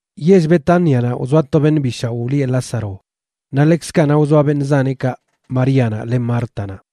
Yell Betánianaꞌ wzoa to beṉꞌ bi shaoꞌ wlieꞌ Lázaro, naꞌ ḻekzkaꞌ naꞌ wzoa beṉꞌ zaneꞌkaꞌ Maríanaꞌ len Mártanaꞌ.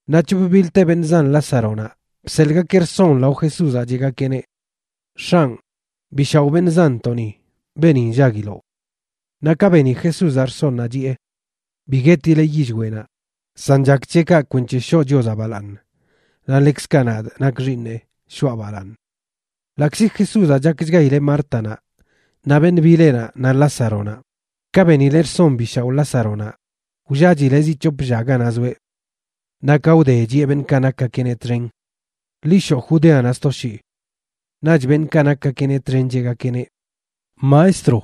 Naꞌ c̱hop bilte beṉꞌ zan Lázaronaꞌ bseḻꞌgakeꞌ rson lao Jesúzaꞌ cheꞌgakeꞌneꞌ: ―X̱anꞌ, bi shaoꞌ beṉꞌ zanntoꞌni, beeni nllaguiloꞌ. Naꞌ ka beni Jesúzaꞌ rsonnaꞌ, chiꞌe: ―Bi guetileꞌ yillweꞌnaꞌ, san chak c̱he kaꞌ kwenc̱he shoꞌ Chiozaꞌ balaaṉ, naꞌ ḻekzkaꞌ nadꞌ, nakꞌ Xiiṉeꞌ, shoꞌa balaaṉ. Ḻaꞌkzi Jesúzaꞌ chakchgaileꞌ Mártanaꞌ, naꞌ beṉꞌ bileꞌnaꞌ naꞌ Lázaronaꞌ, ka benileꞌ rson bi shaoꞌ Lázaronaꞌ, wllachileꞌ zi c̱hop lla ganaꞌ zoeꞌ. Naꞌ ka wde, chiꞌe beṉꞌkaꞌ nakgakeꞌneꞌ txen: ―Ḻi shoꞌ Judeanaꞌ sto shii. Naꞌch beṉꞌkaꞌ nakgakeꞌneꞌ txen cheꞌgakeꞌneꞌ: ―Maestro,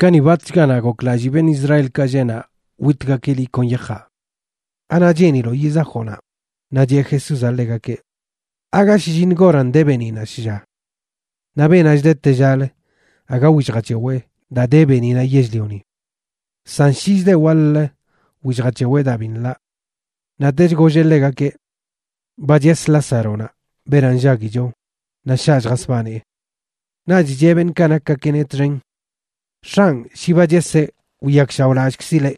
kani batchganaꞌ goklallii beṉꞌ Israelkaꞌ lleꞌ naꞌ witgakeꞌ liꞌ kon yajaꞌ. ¿Anaꞌ cheeniloꞌ yizajoꞌ naꞌ? Naꞌ cheꞌ Jesúzaꞌ ḻegakeꞌ: ―¿Aaga shlliṉ goranꞌ de beeniꞌnaꞌ shlla? Naꞌ beenaꞌ chda tellalə aga willjac̱hewee daa de beeniꞌnaꞌ yell-lioni. San shi chdeꞌ waḻ-lə, willjac̱hewee daa bi nḻaꞌ. Naꞌtech golleꞌ ḻegakeꞌ: ―Ba ches Lázaronaꞌ, beenaꞌ nllaguicho, naꞌ shaꞌ lljasbanee. Naꞌch cheꞌ beṉꞌkaꞌ nakgakeꞌneꞌ txen: ―X̱anꞌ, shi ba cheseꞌ, wiyakshaoꞌlallꞌkzileꞌ.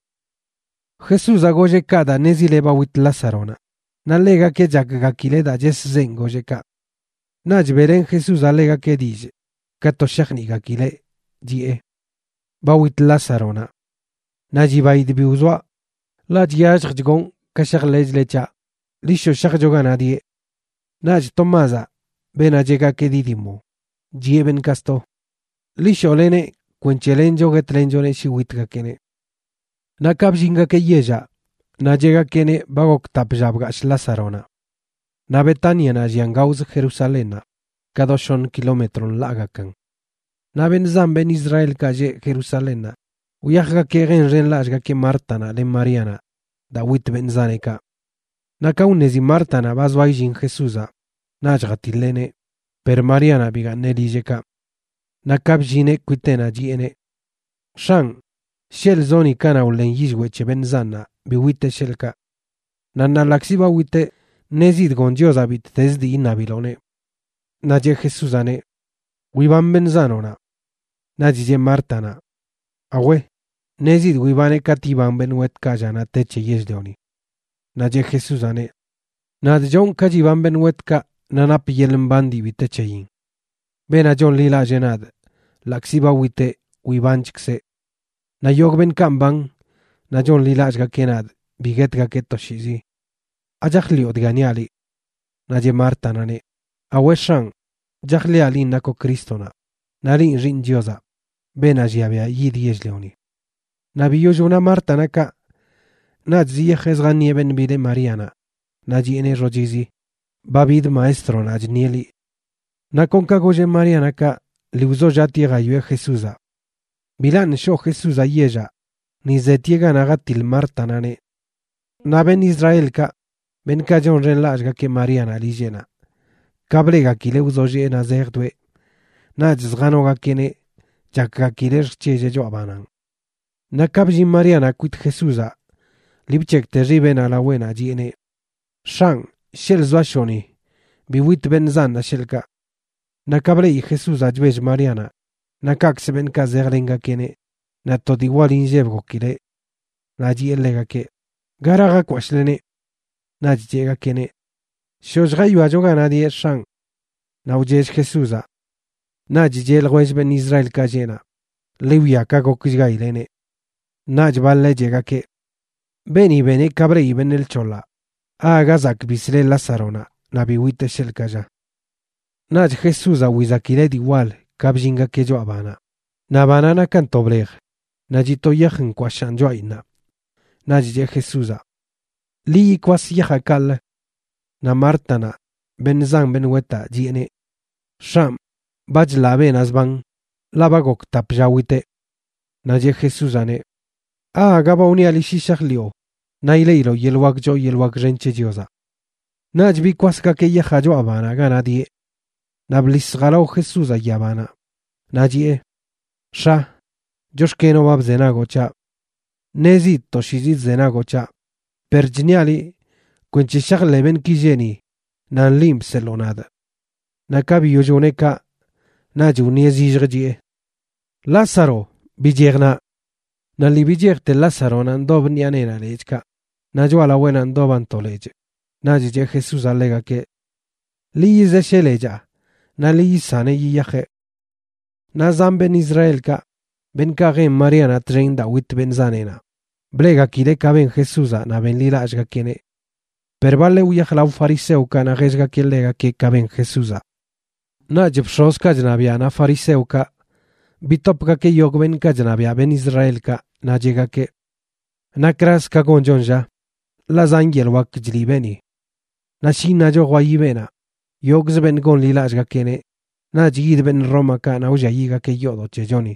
Jesúzaꞌ golleꞌ kaꞌ daa ṉezileꞌ ba wit Lázaronaꞌ, naꞌ ḻegakeꞌ chakgakileꞌ daa cheszenꞌ golleꞌ kaꞌ. Naꞌch beꞌlen Jesúzaꞌ ḻegakeꞌ dillꞌ ka to shajniꞌgakileꞌ, chiꞌe: ―Ba wit Lázaronaꞌ. Naꞌ chibaidꞌ bi wzoaꞌ, ḻaꞌ chyalljch gonꞌ ka shajḻeꞌchle c̱haꞌ. Ḻi shoꞌ shajcho ganaꞌ dieꞌ. Naꞌch Tomázaꞌ, beenaꞌ cheꞌgakeꞌ Dídimoa, chiꞌe beṉꞌkaꞌ sto: ―Ḻi shoꞌleneꞌ kwenc̱he lencho guetlenchoneꞌ shi witgakeꞌneꞌ. Naꞌ ka bllingakeꞌ yellaꞌ, naꞌ cheꞌgakeꞌneꞌ ba gok tap lla bgashꞌ Lázaronaꞌ. Naꞌ Betánianaꞌ llian gaozə Jerusalénnaꞌ, ka do shoṉ kilómetro nḻaagakan. Naꞌ beṉꞌ zan beṉꞌ Israelkaꞌ lleꞌ Jerusalénnaꞌ wyajgakeꞌ jenxenlallꞌgakeꞌ Mártanaꞌ len Maríanaꞌ daa wit beṉꞌ zaneꞌkaꞌ. Naꞌ ka wṉezi Mártanaꞌ ba zoa illin Jesúzaꞌ, naꞌch jatiḻeꞌneꞌ, per Maríanaꞌ bigaaṉeꞌ lilleꞌkaꞌ. Naꞌ ka bllineꞌ kwiteꞌnaꞌ, chiꞌeneꞌ: ―X̱anꞌ, sheḻꞌ zoꞌ ni kanaꞌ wḻen yillweꞌ c̱he beṉꞌ zanꞌnaꞌ bi witeꞌ, sheḻꞌkaꞌ. Naꞌ ṉaa ḻaꞌkzi ba witeꞌ, ṉezidꞌ goṉ Chiozaꞌ bittezə dii iṉabiloꞌneꞌ. Naꞌ cheꞌ Jesúzaꞌneꞌ: ―Wiban beṉꞌ zanoꞌnaꞌ. Naꞌch cheꞌ Mártanaꞌ: ―Awe, ṉezidꞌ wibaneꞌ katꞌ yiban beṉꞌ wetkaꞌ llanaꞌ te c̱he yell-lioni. Naꞌ cheꞌ Jesúzaꞌneꞌ: ―Nadꞌ chonꞌ ka chiban beṉꞌ wetkaꞌ naꞌ napꞌ yeḻꞌ mban dii bi te c̱heyin. Beenaꞌ chonḻilallee nadꞌ, ḻaꞌkzi ba witeꞌ, wibanchkzeꞌ. Naꞌ yogꞌ beṉꞌkaꞌ mban naꞌ chonḻilallꞌgakeꞌ nadꞌ bi guetgakeꞌ toshiizi. ¿Achajḻiꞌo dga niaꞌ liꞌ? Naꞌ cheꞌ Mártanaꞌneꞌ: ―Awe, X̱anꞌ, chajḻiꞌa linꞌ nakoꞌ Crístonaꞌ, naꞌ linꞌ Xiiṉ Chiozaꞌ, beenaꞌ llia biaꞌ yid yell-lioni. Naꞌ biyoll wna Mártanaꞌ kaꞌ, naꞌch ziyajeꞌ zjaṉieꞌ beṉꞌ bileꞌ Maríanaꞌ, naꞌ chiꞌeneꞌ xochizi: ―Ba bid Maestronaꞌ chṉieꞌ liꞌ. Naꞌ kon ka golleꞌ Maríanaꞌ kaꞌ, lii wzollaꞌtieꞌ jawieꞌ Jesúzaꞌ. Bilaṉꞌ shoꞌ Jesúzaꞌ yellaꞌ, ni zetieꞌ ganaꞌ jatiḻ Mártanaꞌneꞌ. Naꞌ beṉꞌ Israelkaꞌ, beṉꞌkaꞌ chonxenlallꞌgakeꞌ Maríanaꞌ lilleꞌnaꞌ, ka bleꞌgakileꞌ wzollee naꞌ zejdoeꞌ, naꞌch zjanogakeꞌneꞌ chakgakileꞌ lljc̱helleꞌ choꞌa bananꞌ. Naꞌ ka bllin Maríanaꞌ kwit Jesúzaꞌ, lii bc̱hekꞌte xibeꞌnaꞌ laweꞌnaꞌ chiꞌeneꞌ: ―X̱anꞌ, sheḻꞌ zoashoꞌ ni, bi wit beṉꞌ zanꞌnaꞌ, sheḻꞌkaꞌ. Naꞌ ka bleꞌi Jesúzaꞌ chbell Maríanaꞌ, naꞌ kaꞌkzə beṉꞌkaꞌ zejlengakeꞌneꞌ, naꞌ to dii wal inlleb gokileꞌ. Naꞌ chiꞌe ḻegakeꞌ: ―¿Gara jakwashꞌleneꞌ? Naꞌch cheꞌgakeꞌneꞌ: ―Shoꞌ lljawiacho ganaꞌ dieꞌ, X̱anꞌ. Naꞌ wchell Jesúzaꞌ. Naꞌch cheꞌ ljwell beṉꞌ Israelkaꞌ lleꞌ naꞌ: ―Ḻi wwia ka gokchgaileꞌneꞌ. Naꞌch baḻeꞌ cheꞌgakeꞌ: ―Beeni beneꞌ ka bleꞌi beṉꞌ lc̱hoḻaꞌ, ¿Aaga zak bisleꞌ Lázaronaꞌ, naꞌ bi witeꞌ sheḻꞌkaꞌ, lla? Naꞌch Jesúzaꞌ wizakileꞌ dii wal ka bllingakeꞌ choꞌa banaꞌ. Naꞌ banaꞌ nakan to blej, naꞌ chiꞌ to yaj nkwashaꞌn choꞌayinnaꞌ. Naꞌch cheꞌ Jesúzaꞌ: ―Ḻi yikwas yajaꞌ kaꞌlə. Naꞌ Mártanaꞌ, beṉꞌ zan beṉꞌ wetaꞌ, chiꞌeneꞌ: ―X̱anꞌ, ba chḻaꞌ beenaꞌ zban, ḻaꞌ ba gok tap lla witeꞌ. Naꞌ cheꞌ Jesúzaꞌneꞌ: ―¿Aaga ba wniaꞌ liꞌ shi shajḻiꞌo, naꞌ ileꞌiloꞌ yeḻꞌ wak choo yeḻꞌ wak xen c̱he Chiozaꞌ? Naꞌch bikwasgakeꞌ yajaꞌ choꞌa banaꞌ ganaꞌ dieꞌ. Naꞌ bḻis jalao Jesúzaꞌ yabanaꞌ, naꞌ chiꞌe: ―X̱a, chox̱kenoꞌ ba bzenagoꞌ c̱haꞌ. Ṉezidꞌ toshiizi chzenagoꞌ c̱haꞌ, per chṉiaꞌ liꞌ kwenc̱he shajḻeꞌ beṉꞌki lleꞌ ni nan linꞌ bseḻoo nadꞌ. Naꞌ ka biyoll wneꞌ kaꞌ, naꞌch wṉieꞌ zillj, chiꞌe: ―¡Lázaro, bichej naꞌ! Naꞌ lii bichejte Lázaronaꞌ ndob ṉiꞌa neenaꞌ lechꞌkaꞌ, naꞌ choꞌalaweꞌnaꞌ ndoban to lechꞌ. Naꞌch cheꞌ Jesúzaꞌ ḻegakeꞌ: ―Ḻi yizesheꞌ lechaa naꞌ ḻi yisaneꞌ yiyajeꞌ. Naꞌ zan beṉꞌ Israelkaꞌ, beṉꞌkaꞌ jen Maríanaꞌ txen daa wit beṉꞌ zaneꞌnaꞌ, bleꞌgakileꞌ ka ben Jesúzaꞌ naꞌ benḻilallꞌgakeꞌneꞌ. Per baḻeꞌ wyaj lao fariseokaꞌ naꞌ jellgakeꞌ ḻegakeꞌ ka ben Jesúzaꞌ. Naꞌch bx̱ozkaꞌ chṉabiaꞌ naꞌ fariseokaꞌ bitopgakeꞌ yogꞌ beṉꞌkaꞌ chṉabiaꞌ beṉꞌ Israelkaꞌ, naꞌ cheꞌgakeꞌ: ―¿Nakraz ka gonchon, lla? Ḻaꞌ zan yeḻꞌ wak chliꞌ beeni. Naꞌ shi iṉacho jwayi beenaꞌ, yogꞌz beṉꞌ gonḻilallꞌgakeꞌneꞌ naꞌch yid beṉꞌ Rómakaꞌ naꞌ wlliayiꞌgakeꞌ yoodoꞌ c̱hechoni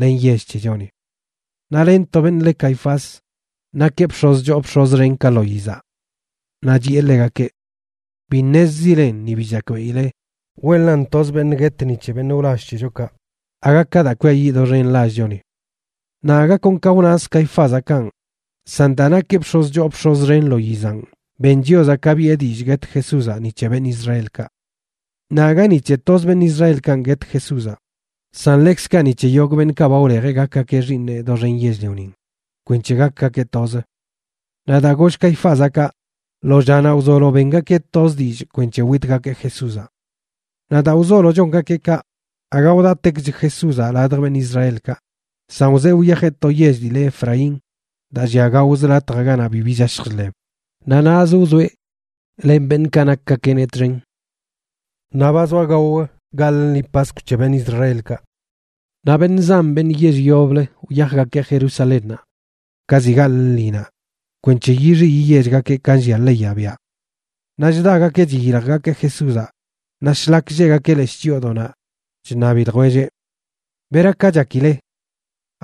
len yell c̱hechoni. Naꞌ len to beṉꞌ leꞌ Caifás, nakeꞌ bx̱oz choo bx̱oz xen ka lo yizaꞌ. Naꞌ chiꞌe ḻegakeꞌ: ―Bi ṉezzilen, ni bi chakbeꞌile wenlan toz beṉꞌ guet ni c̱he beṉꞌ wlall c̱hechokaꞌ, aga ka daa kwiayiꞌ doxen lallchoni. Naꞌ aga kon ka wnaz Caifázaꞌ kanꞌ, san daa nakeꞌ bx̱oz choo bx̱oz xen lo yizanꞌ, ben Chiozaꞌ ka biꞌe dillꞌ guet Jesúzaꞌ ni c̱he beṉꞌ Israelkaꞌ. Naꞌ aga ni c̱he toz beṉꞌ Israelkanꞌ guet Jesúzaꞌ, san ḻekzkaꞌ ni c̱he yogꞌ beṉꞌkaꞌ ba wlejeꞌ gakgakeꞌ xiiṉeꞌ doxen yell-lionin, kwenc̱he gakgakeꞌ toz. Naꞌ daa goll Caifázaꞌ kaꞌ, lo llanaꞌ wzolo bengakeꞌ toz dillꞌ kwenc̱he witgakeꞌ Jesúzaꞌ. Naꞌ daa wzolo chongakeꞌ kaꞌ, aga wdatekch Jesúzaꞌ ladj beṉꞌ Israelkaꞌ, san wzee wyajeꞌ to yell dii le Efraín, daa llia gaozə latjaꞌ ganaꞌ bibi chashj chḻeb, naꞌ naꞌz wzoeꞌ len beṉꞌkaꞌ nakgakeꞌneꞌ txen. Naꞌ ba zoa gao gaḻꞌ lṉi Paskw c̱he beṉꞌ Israelkaꞌ, naꞌ beṉꞌ zan beṉꞌ yell yoblə wyajgakeꞌ Jerusalénnaꞌ ka ziꞌ gaḻꞌ lṉinaꞌ kwenc̱he yixi yiyechgakeꞌ ka nllia leyaꞌ biaꞌ. Naꞌ chdagakeꞌ chiyiljgakeꞌ Jesúzaꞌ, naꞌ shlak lleꞌgakeꞌ leshꞌ chyoodoꞌnaꞌ, chṉabi ljwelleꞌ: ―¿Beraka chakile?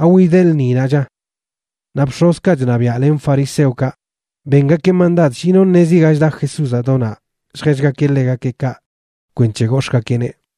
¿Awideꞌ lṉinaꞌ, lla? Naꞌ bx̱ozkaꞌ chṉabiaꞌ len fariseokaꞌ bengakeꞌ mandad shi no ṉezi ga chda Jesúzaꞌ do naꞌ lljellgakeꞌ ḻegakeꞌ kaꞌ kwenc̱he gox̱ꞌgakeꞌneꞌ.